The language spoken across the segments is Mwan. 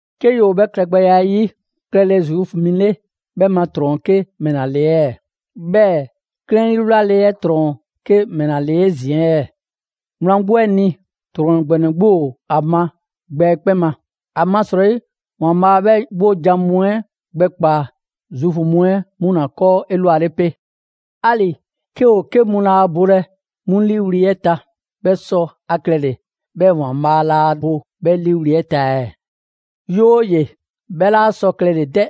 'Ke ‑yoo 'bhɛ klɛgbɛya 'ɛ 'yi, klɛle Zuufu mi 'le 'bhɛ ma ‑trɔn ‑o 'ke ‑mɛla ‑le ɛɛ? 'Bhɛɛ‑ 'klɛɛn 'yi wlale 'ɛ 'trɔn‑ ‑o 'ke ‑mɛla ‑le 'ezin‑ ɛɛ? Wlan 'gbu 'ɛ ni, ‑trɔn ‑gbɛnɛ 'gbu ‑o ‑a ma gbɛ 'ɛ 'kpɛn ma. ‑Amasrɔyi, ‑Waanbhaa' 'bhɛ 'wojan‑ mu 'ɛ gbɛkpaa‑ Zuufu mu 'ɛ 'mu ‑la ‑kɔɔ' 'elwale 'pe. 'Ali‑ 'ke ‑o 'ke mu laa bolɛ 'mu 'liiwli‑ 'ɛ ta, 'bhɛ sɔ ‑a klɛle‑ 'bhɛɛ‑ ‑Waanbhaa' laa bo 'bhɛ ‑liiwli' 'ɛ ta ɛɛ? 'Yooye‑, 'bhɛ 'laa sɔ klɛle‑ 'dɛ!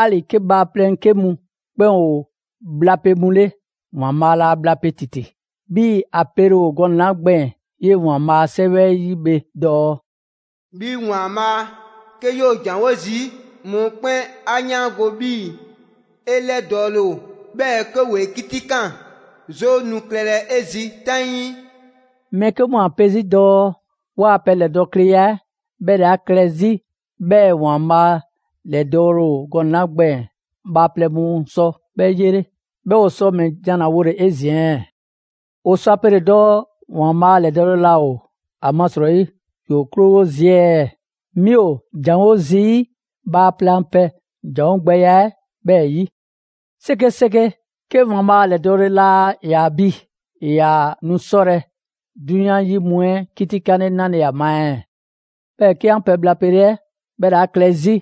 'Ali‑ 'ke bhaaplɛŋ 'ke mu 'kpɛn ‑o bhlape mu 'le, ‑Waanbhaa' laa bhlape ‑titi. 'Bhii‑ ‑a pele ‑o gɔnɛ‑ 'la gbɛɛn‑ 'yee‑ ‑Waanbhaa' a 'Sɛwɛ 'ɛ 'yi bhe dɔɔ: «'Bhi ‑Waanbhaa', 'ke 'yoo‑ ‑janwo' zii', mɔkpɛn' 'a 'yaango‑ 'bhii‑ 'e 'lɛdɔɔle ‑o. 'Bhɛɛ‑ 'ke ‑woo 'e 'kitikaan, 'zoo nu klɛlɛ 'e zi 'taŋii.» Mɛɛ 'ke mu ‑o ‑a pe 'zi dɔɔ: «'Waa‑ pɛ ‑lɛdɔɔkleya 'ɛ 'bhɛ ‑le 'a klɛ 'zi 'bhɛɛ‑ ‑Waanbhaa' ‑lɛdɔɔle ‑o gɔnɛ‑ 'la gbɛɛn‑ bhaaplɛŋ mu sɔ 'bhɛ 'yele.» 'Bhɛɛ‑ 'o sɔ ‑mɛ ‑jan ‑la wole‑ 'ezin‑ ɛɛ? 'O sɔ ‑a pele‑ dɔɔ ‑Waanbhaa' ‑lɛdɔɔle laa ‑o, ‑amasrɔyi ‑yoo' 'krowo zii' ɛɛ? ('Mi ‑o ‑janwo' zii bhaaplɛŋ a pɛ ‑janwo' gbɛya 'ɛ 'bhɛɛ‑ 'yi). 'Sekeseke! 'Ke ‑Waanbhaa' ‑lɛdɔɔle laa ‑yaa bi, ‑e ‑yaa nu 'sɔlɛ‑ 'drunyan 'yi mu 'ɛ 'kitikanle 'nale‑ ‑a ma ɛɛ? 'Bhɛɛ‑ 'ke 'an pɛ bhla pele 'ɛ 'bhɛ ‑le 'a klɛ 'zi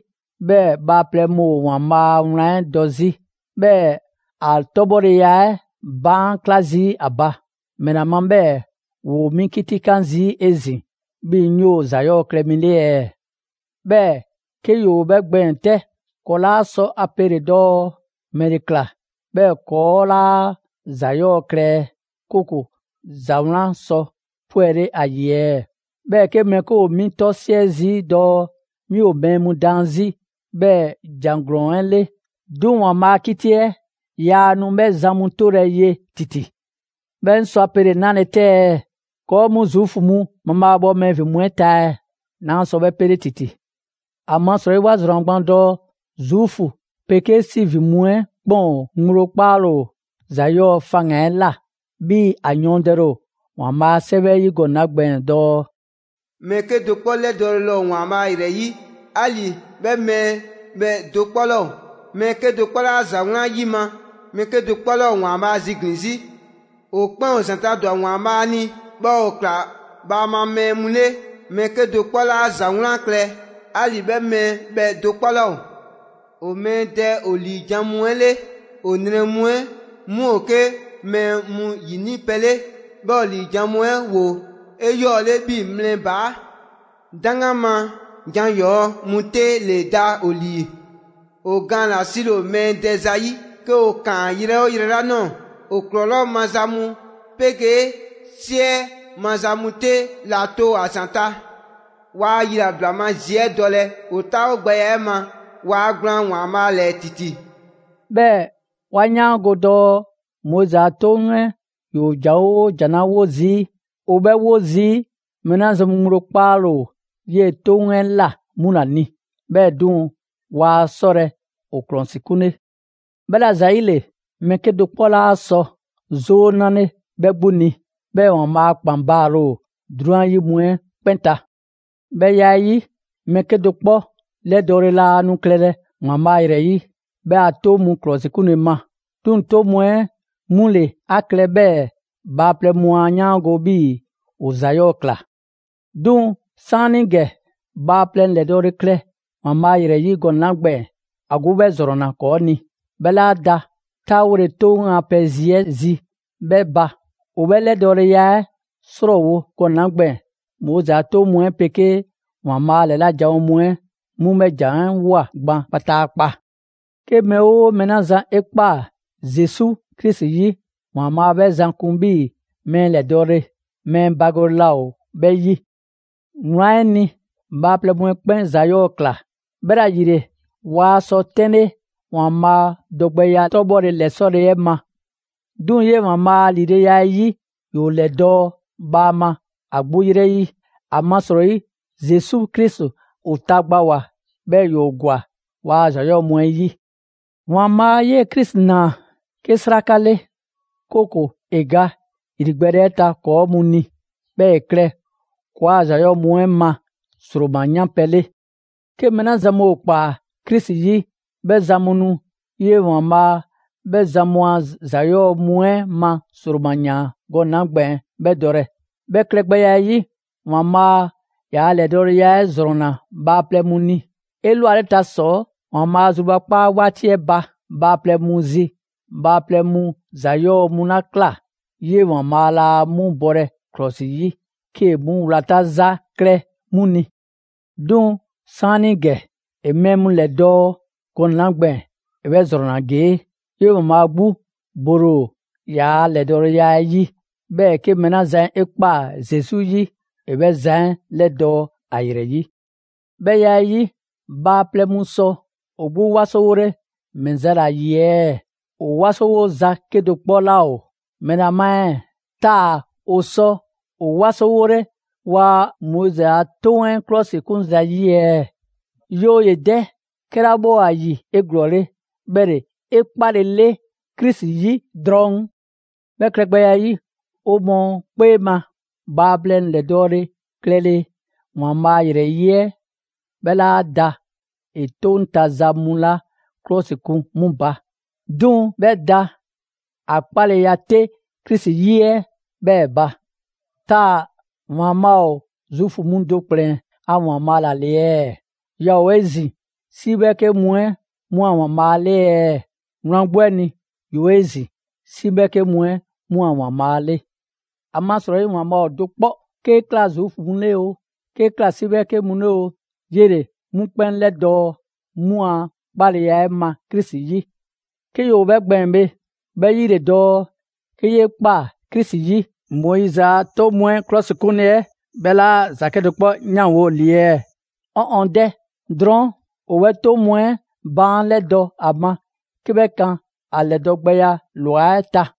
'bhɛɛ‑ bhaaplɛŋ mu ‑o ‑Waanbhaa' a wlan 'ɛ dɔ 'zi, 'bhɛɛ‑ ‑a 'tɔbhɔleya 'ɛ baan' 'kla zii' ‑a ba; ‑mɛla ma 'bhɛɛ‑ ‑woo 'mi 'kitikan zii' 'ezin‑ 'bhii‑ 'ŋ 'yoo‑ ‑za 'yɔɔ‑ klɛ mi 'le ɛɛ? 'Bhɛɛ‑ 'ke ‑yoo 'bhɛ gbɛɛn‑ 'tɛ, ‑kɔɔ' 'laa sɔ ‑a pele‑ dɔɔ: «‑Mɛle ‑kla 'bhɛɛ‑ ‑kɔɔ' 'laa ‑za 'yɔɔ‑ klɛ, 'kooko‑ ‑za 'wlan sɔ 'pwɛle ‑a ‑yi ɛɛ?» Mɛɛ 'ke mu ‑o 'mi 'tɔsiɛ zii' dɔɔ 'mi ‑o mɛɛ mu daan 'zi 'bhɛɛ‑ ‑jan ‑glɔɔn 'ɛ 'le. 'Duŋ‑ ‑Waanbhaa' a 'kiti 'ɛ yaa nu 'bhɛ zan mu 'tolɛ‑ ye ‑titi. 'Bhɛɛ‑ 'ŋ sɔ a pele‑ 'nale‑ 'tɛ ɛɛ? ‑Kɔɔ' mu Zuufu mu mabhaabhɔ mɛɛ ‑vin mu 'ɛ ta ɛɛ? 'Naa sɔ 'bhɛ 'pele ‑titi! ‑Amasrɔyi 'wa ‑zrɔnna gban dɔɔ Zuufu 'pegee 'si ‑vin mu 'ɛ ‑o 'kpɛn ŋgblo 'kpaale‑ ‑o ‑za 'yɔɔ‑ faŋgan‑ 'ɛ ꞊la. 'Bhii‑ ‑a yɔɔndɛle ‑o ‑Waanbhaa' a 'Sɛwɛ 'ɛ 'yi gɔnɛ‑ 'la gbɛɛn‑ dɔɔ: «Mɛɛ 'kedo‑ 'kpɔ 'lɛdɔɔle laa ‑o ‑Waanbhaa' ‑yrɛ 'yi, 'ali‑ 'bhɛ mɛɛ bhɛ do 'kpɔ 'laa ‑o. Mɛɛ 'kedo‑ 'kpɔ 'laa ‑za 'wlan 'yima‑, mɛɛ 'kedo‑ 'kpɔ 'laa ‑o ‑Waanbhaa' ziglin‑ 'zi. ‑O 'kpɛn ‑o ‑zanta' ‑dwa ‑Waanbhaa' ni, 'bhɛɛ‑ ‑o ꞊kla bhaama mɛɛ mu 'le. Mɛɛ 'kedo‑ 'kpɔ 'laa ‑za 'wlan klɛ, 'ali‑ 'bhɛ mɛɛ bhɛ do 'kpɔ 'laa ‑o. ‑O mɛɛ dɛ ‑o ‑liijan' mu 'ɛ 'le, ‑o nrɛ mu 'ɛ 'mu ‑o 'ke mɛɛ mu ‑yini' pɛ 'le, 'bhɛɛ‑ ‑o ‑liijan' mu 'ɛ ‑woo 'eyɔɔle 'bhii‑ mlɛ ‑baa'. 'Daŋgan ma jan 'yɔɔ‑ mu 'te ‑le da ‑o ‑lii. ‑O gaan ‑la 'sile‑ ‑o mɛɛ dɛ ‑zayi'. 'Ke ‑o ‑kaan yrɛ 'oo yrɛ 'la ꞊nɔɔ, ‑o ‑klɔlɔɔ' maza mu 'pegee 'siɛ maza mu 'te ‑la to ‑a ‑zanta'. Waa yilabla ma zi 'ɛ dɔlɛ. ‑O 'taawogbɛya 'ɛ ma, waa gblaan ‑Waanbhaa' ‑lɛɛ ‑titi.» 'Bhɛɛ‑ 'wa 'yaango‑ dɔɔ Moizi a 'Toŋ 'ɛ ‑yoo ‑jan 'oo ‑jan 'la 'wo zii', ‑o 'bhɛ 'wo zii' mɛɛ 'la zan mu ŋgblo 'kpaale‑ 'yee‑ 'toŋ 'ɛ ꞊la 'mu ‑la ni. 'Bhɛɛ‑ 'duŋ‑, waa 'sɔlɛ‑ ‑o ‑klɔsikunle. 'Bhɛla‑ ‑zayile, mɛɛ 'kedo‑ 'kpɔ 'laa sɔ 'zoo 'nale 'bhɛ 'gbu ni, 'bhɛɛ‑ ‑Waanbhaa' a ‑kpan baale ‑o 'drunyan 'yi mu 'ɛ 'kpɛn ta. 'Bhɛ ya 'ɛ 'yi, mɛɛ 'kedo‑ 'kpɔ 'lɛdɔɔle laa nu klɛlɛ ‑Waanbhaa' ‑yrɛ 'yi 'bhɛ a 'toŋ mu ‑klɔsikunle ma. 'Duŋ‑ 'toŋ mu 'ɛ 'mu ‑le 'a klɛ 'bhɛɛ‑ bhaaplɛŋ mu 'a 'yaango‑ 'bhii‑ ‑o ‑za 'yɔɔ‑ ꞊kla. 'Duŋ‑ 'saanigɛ, bhaaplɛŋ ‑lɛdɔɔle klɛ ‑Waanbhaa' ‑yrɛ 'yi gɔnɛ‑ 'la gbɛɛn‑, ‑a 'gbu 'bhɛ ‑zrɔnna ‑kɔɔ' ni. 'Bhɛ 'laa da 'taawole 'toŋ a pɛ zi 'ɛ zi 'ɛ 'bhɛ ba. ‑O 'bhɛ ‑lɛdɔɔleya 'ɛ 'srɔɔwo‑ gɔnɛ‑ 'la gbɛɛn‑, Moizi a 'toŋ mu 'ɛ 'pegee ‑Waanbhaa' ‑lɛla' janwo mu 'ɛ 'mu 'bhɛ ‑jan 'ɛ ꞊woa gban kpataakpa. 'Ke mɛɛ 'oo mɛɛ 'la zan 'e ꞊kpaa Zesu Krisi 'yi, ‑Waanbhaa' 'bhɛ zan kun 'bhii‑ mɛɛ ‑lɛdɔɔle; mɛɛ bagole laa ‑o 'bhɛ 'yi. Wlan 'ɛ ni, bhaaplɛŋ mu 'kpɛn ‑za 'yɔɔ‑ ꞊kla; 'bhɛla‑ ‑yile, waa sɔ 'tɛnle ‑Waanbhaa' dɔgbɛya 'tɔbhɔle ‑lɛsɔle 'ɛ ma. 'Duŋ‑ 'yee‑ ‑Waanbhaa' a ‑lileya 'ɛ yi, ‑yoo ‑lɛdɔɔ' bhaama ‑a 'gbu 'yrɛ 'yi; ‑amasrɔyi Zesu Krisi ‑o tagbawoa, 'bhɛɛ‑ ‑yoo ‑gwa waa ‑za 'yɔɔ‑ mu 'ɛ 'yi. ‑Waanbhaa' 'yee‑ Krisi ꞊naa 'ke 'sraka 'le, 'kooko‑ ‑e ga ‑yrigbɛɛle 'ɛ ta ‑kɔɔ' mu ni, 'bhɛɛ‑ ‑e klɛ ‑kɔɔa' ‑za 'yɔɔ‑ mu 'ɛ ma ‑sroma 'yan pɛ 'le. 'Ke mɛɛ 'la zan mu ‑o ꞊kpaa Krisi 'yi, 'bhɛ zan mu nu 'yee‑ ‑Waanbhaa' 'bhɛ zan mu a ‑za 'yɔɔ‑ mu 'ɛ ma ‑sroma ꞊yaan gɔnɛ‑ 'la gbɛɛn‑ 'bhɛ dɔlɛ. 'Bhɛ klɛgbɛya 'ɛ 'yi, ‑Waanbhaa' ‑yaa' ‑lɛdɔɔleya 'ɛ ‑zrɔnna bhaaplɛŋ mu ni. 'Elwaleta ‑sɔ, ‑Waanbhaa' a zrubakpaa 'waati 'ɛ ba bhaaplɛŋ mu zi, bhaaplɛŋ mu ‑za 'yɔɔ‑ mu 'la ꞊kla, 'yee‑ ‑Waanbhaa' laa 'mu bɔlɛ ‑klɔsi 'yi 'kee‑ 'mu wlata ‑za klɛ 'mu ni. 'Duŋ‑ 'saanigɛ, ‑e mɛɛ mu ‑lɛdɔɔ' gɔnɛ‑ 'la gbɛɛn‑, ‑e 'bhɛ ‑zrɔnna ‑gee': 'yee‑ ‑Waanbhaa' 'gbu bole ‑o ‑yaa' ‑lɛdɔɔleya 'ɛ 'yi, 'bhɛɛ‑ 'ke mɛɛ 'la zan 'e ꞊kpaa Zesu 'yi, ‑e 'bhɛ zan 'ɛ 'lɛdɔɔ‑ ‑a ‑yrɛ 'yi. 'Bhɛ ya 'ɛ 'yi, bhaaplɛŋ mu sɔ ‑o 'gbu 'wasowole ‑mɛ za ‑la ‑yi ɛɛ? ‑O 'wasowo za 'kedo‑ 'kpɔ 'laa ‑o! ‑Mɛla ma ɛɛ? Taa‑ ‑o sɔ ‑o 'wasowole ‑waa' Moizi a 'Toŋ 'ɛ 'klɔsikun ‑zayi' ɛɛ? 'Yooye‑ 'dɛ! 'Kɛla 'bhɛ ‑o ‑a ‑yi 'eglɔɔle, 'bhɛ ‑le 'e 'kpalele Krisi 'yi drɔŋ. 'Bhɛ klɛgbɛya 'yi, 'o mɔɔ 'kpee ma, bhaaplɛŋ ‑lɛdɔɔle klɛle ‑Waanbhaa' ‑yrɛ 'yi 'ɛ, 'bhɛ 'laa da ‑e 'toŋ ta za mu 'la 'klɔsikun 'mu ba; 'duŋ‑ 'bhɛ da ‑a 'kpaleya 'te Krisi 'yi 'ɛ 'bhɛɛ‑ ba. Taa‑ ‑Waanbhaa' ‑o Zuufu mu do ‑kplɛn a ‑Waanbhaa' ‑la ‑le ɛɛ? Yaa ‑o 'ezin‑ 'si 'bhɛɛke mu 'ɛ 'mu a ‑Waanbhaa' 'le ɛɛ? Wlan 'gbu 'ɛ ni, ‑yoo 'ezin‑ 'si 'bhɛɛke mu 'ɛ 'mu a ‑Waanbhaa' 'le. ‑Amasrɔyi ‑Waanbhaa' ‑o do 'kpɔ. 'Kee‑ ꞊kla Zuufu mu 'le oo, 'kee‑ ꞊kla 'si 'bhɛɛke mu 'le oo, 'yele‑ 'mu 'kpɛn 'lɛdɔɔ‑ 'mu a 'kpaleya ma Krisi 'yi. 'Ke ‑yoo 'bhɛ gbɛɛn‑ bhe, 'bhɛ 'yi ‑le dɔɔ 'ke 'yee ꞊kpaa Krisi 'yi, Moizi a 'toŋ mu 'ɛ ‑klɔsikunle 'ɛ 'bhɛ 'laa ‑za 'kedo‑ 'kpɔ 'yanwo‑ ‑li ɛɛ? 'Ɔn ɔn 'dɛ! Drɔɔn', 'o 'bhɛ 'toŋ mu 'ɛ baan' 'lɛdɔ‑ ‑a ma 'ke 'bhɛ kan ‑a ‑lɛdɔ' gbɛya ‑lwa 'ɛ ta.